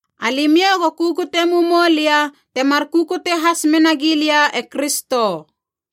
Alimiou go kukute mumou lia temar kukute has mena gilia e Kristo.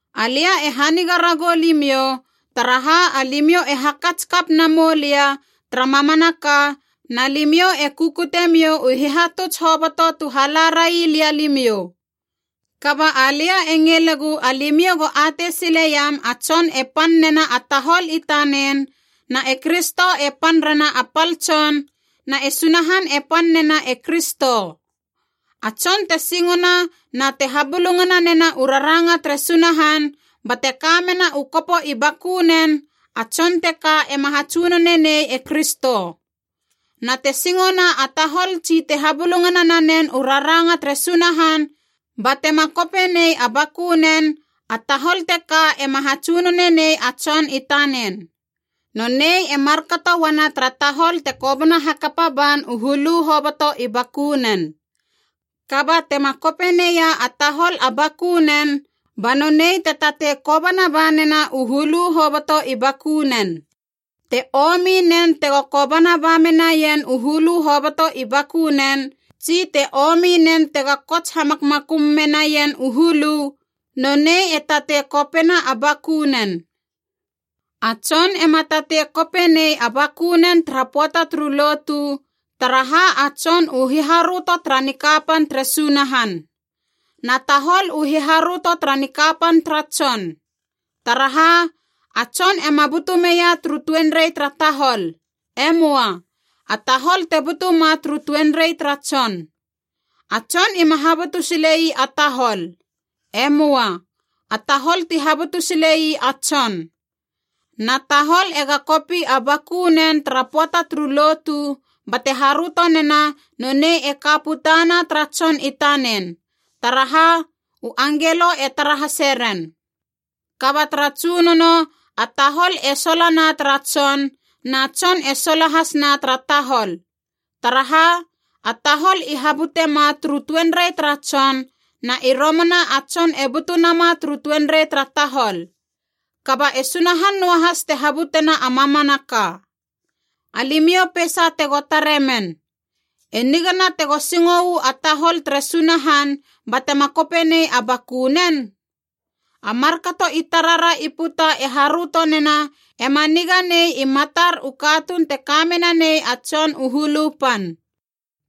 Alia e haniga ragou limiou, taraha alimiou e hakats kap namou lia tara mamanaka na limiou e kukutemiou u hihatuts hoboto tu hala railia limiou. Kaba alia e ngilegu alimiou go atei sileiam a tson e pan nena a tahol i tanen, na e Kristo e pan rena a pal tson, na e Sunahan e pan nena e Kristo. A tson te singona na te habulungana nena u raranga tere Sunahan bate ka mena u kopo i bakunen, a tson teka ema hatsunone nei e Kristo. Na te singona a tahol tsi te habulungana nanen u raranga tere Sunahan batema kope nei a bakunen, a tahol teka ema hatsunone nei a tson i tanen. Nonei e markato uana tara tahol te kobana hakapa ban u hulu hoboto i bakunen. Kaba tema kope neia a tahol a bakunen, ba nonei te tatei kobana ba nena u hulu hoboto i bakunen. Te omi nen tego kobana ba menaien u hulu hoboto i bakunen, tsi te omi nen tega kots hamakmakum menaien u hulu, nonei e tatei kopena a bakunen. A tson ema tatei kope nei a bakunen tara pöata turu lotu, taraha a tson u hiharöto tara nikapan tere Sunahan. Na tahol u hiharöto tara nikapan tara tson. Taraha, a tson ema butu meia turu tuenrei tara tahol. E möa. A tahol te butu ma turu tuenrei tara tson. A tson ima habutu sile ii a tahol. E möa. A tahol ti habutu sile ii a tson. Na tahol ega kopi a bakunen tara pöata turu lotu bate haröto nena nonei e ka putana tara tson i tanen, taraha, u angelo e tara hase ren. Kaba tara Tsunono, a tahol e sola na tara tson, na tson e sola hasna tara tahol. Taraha, a tahol i habutema turu tuenrei tara tson, na i romana a tson e butu nama turu tuenrei tara tahol. Kaba e Sunahan noahas te habutena a mamanaka. Alimiou peisa tego tare men. E nigana tego singo uu a tahol tere Sunahan batema kope nei a bakunen? A markato i tarara i puta e haröto nena, ema niga nei i matar u katuun te ka menanei a tson u hulu pan.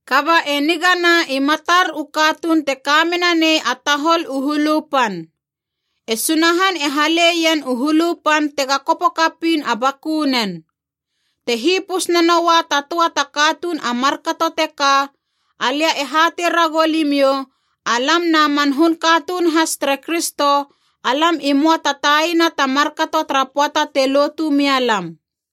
Kaba e nigana i matar u katuun te ka menanei a tahol u hulu pan. E Sunahan e hale ien u hulu pan tega kopo kapiin a bakunen. Te hipus nanoua ta töa ta katuun a markato teka, alia e hatei ragou limiou alam na man hun katuun has tere Kristo alam i möa ta taina ta markato tara pöata te lotu mia lam.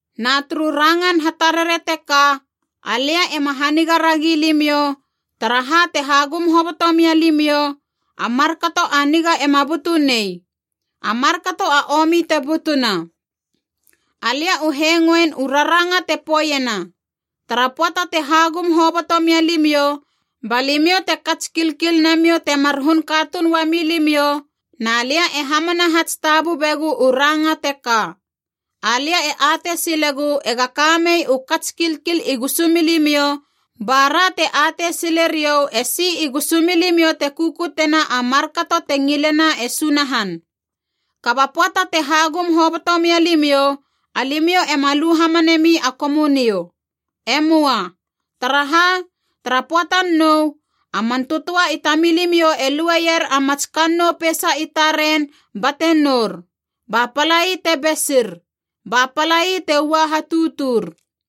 Na turu rangan hatarare teka, alia ema haniga ragi limiou, taraha te hagum hoboto mia limiou, a markato a niga ema butu nei, a markato a omi te butuna. Alia u hengoin u raranga te poeiena: tara pöata te hagum hoboto mia limiou, ba limiou te kats kilkil namiou temar hun katuun uami limiou, na lia e hamana hats tabubegu u ranga teka. Alia e atei silegu ega kamei u kats kilkil i gusumilimiou, ba ra te atei sileriou esi i gusumilimiou te kukutena a markato te ngilena e Sunahan. Kaba pöata te hagum hoboto mia limiou, alimiou ema lu hamanemi a Komunio. E möa. Taraha, tara pöatan nou, a man tötöa i tamilimiou e lueier a mats kannou peisa i taren bate nour, ba palai te besir, ba palai te ua hatutur.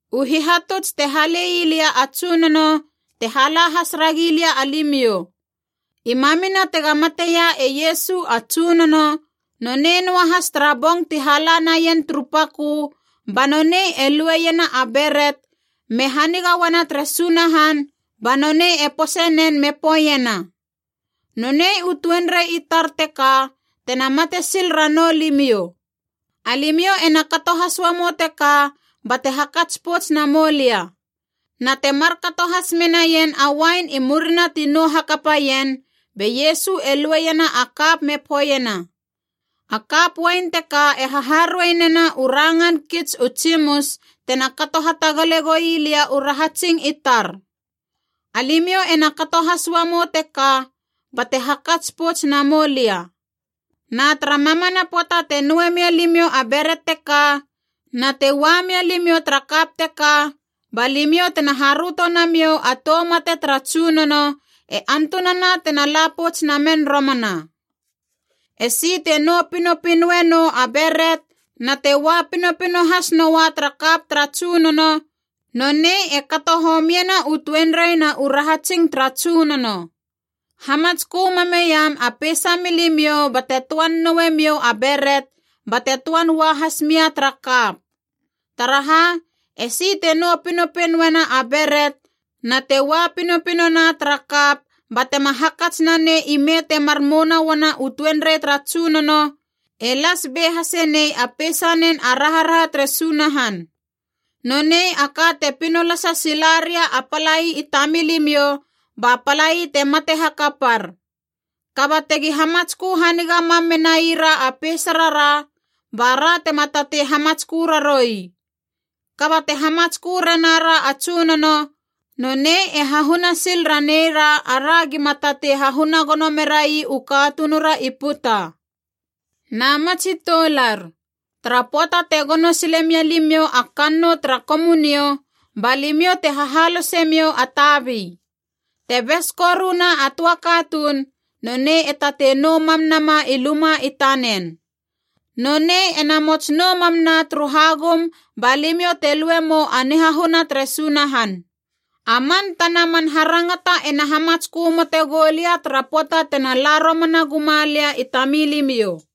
U hihatuts te hale ii lia a Tsunono, te hala has ragilia alimiou. I mamina tega mateia e Iesu a Tsunono, nonei noahas tara bong ti hala naien turu pakö, banonei e lueiena a beret me haniga uana tere Sunahan, ba nonei e pose nen me poeiena, “Nonei u tuenrei i tar teka tena mate sil ranou limiou. Alimiou ena kato has uamou teka bate hakats pouts namou lia.” Na te markato has menaien a uain i murina ti nou hakapaien, be Iesu e lueiena a kap me poeiena, “A kap uain teka e haharuei nena u rangan kits u tsimus tena kato hatagale goi lia u rahatsing i tar. Alimiou ena kato has uamou teka bate hakats pouts namou lia.” Na tara mamana pöata te noue mia limiou a beret teka na te ua mia limiou tara kap teka, ba limiou tena haröto namiou a tou mate tara Tsunono, e antunana tena la pouts namen romana. Esi te nou pinopinoe nou a beret na te ua pinopino has noua tara kap tara Tsunono, nonei e kato homiena u tuenrei na u rahatsing tara Tsunono. Hamatskö mameiam a peisa milimiou bate töan noue miou a beret bate töan ua hasmia tara kap. Taraha, esi te nou pinopinoena a beret na te ua pinopinona tara kap batema hakats na nei ime temar mouana uana u tuenrei tara Tsunono, e las be hase nei a peisanen a raharaha tere Sunahan. Nonei a ka te pinolasa sila ria a palai i tamilimiou, ba palai te mate hakapar. Kaba tegi hamatskö haniga mam menaira a peisarara, bara tema tatei hamatskö raroui. Kaba te hamatskö rena ra a Tsunono, nonei e hahuna sil raneira ara gima tatei hahuna gono merai u katunura i puta. Na ma tsi toular, tara pöata te gono sile mia limiou a kannou tara Komunio, ba limiou te hahalosemiou a tabi. Te bes koruna a töa katuun, nonei e tatei nou mam nama i luma i tanen. Nonei ena mots nou mamna turu hagum ba limiou te lue mou a nihahuna tere Sunahan. A man tana man harangata ena hamatskö mote goulia tara pöata tena la romana guma lia i tamilimiou.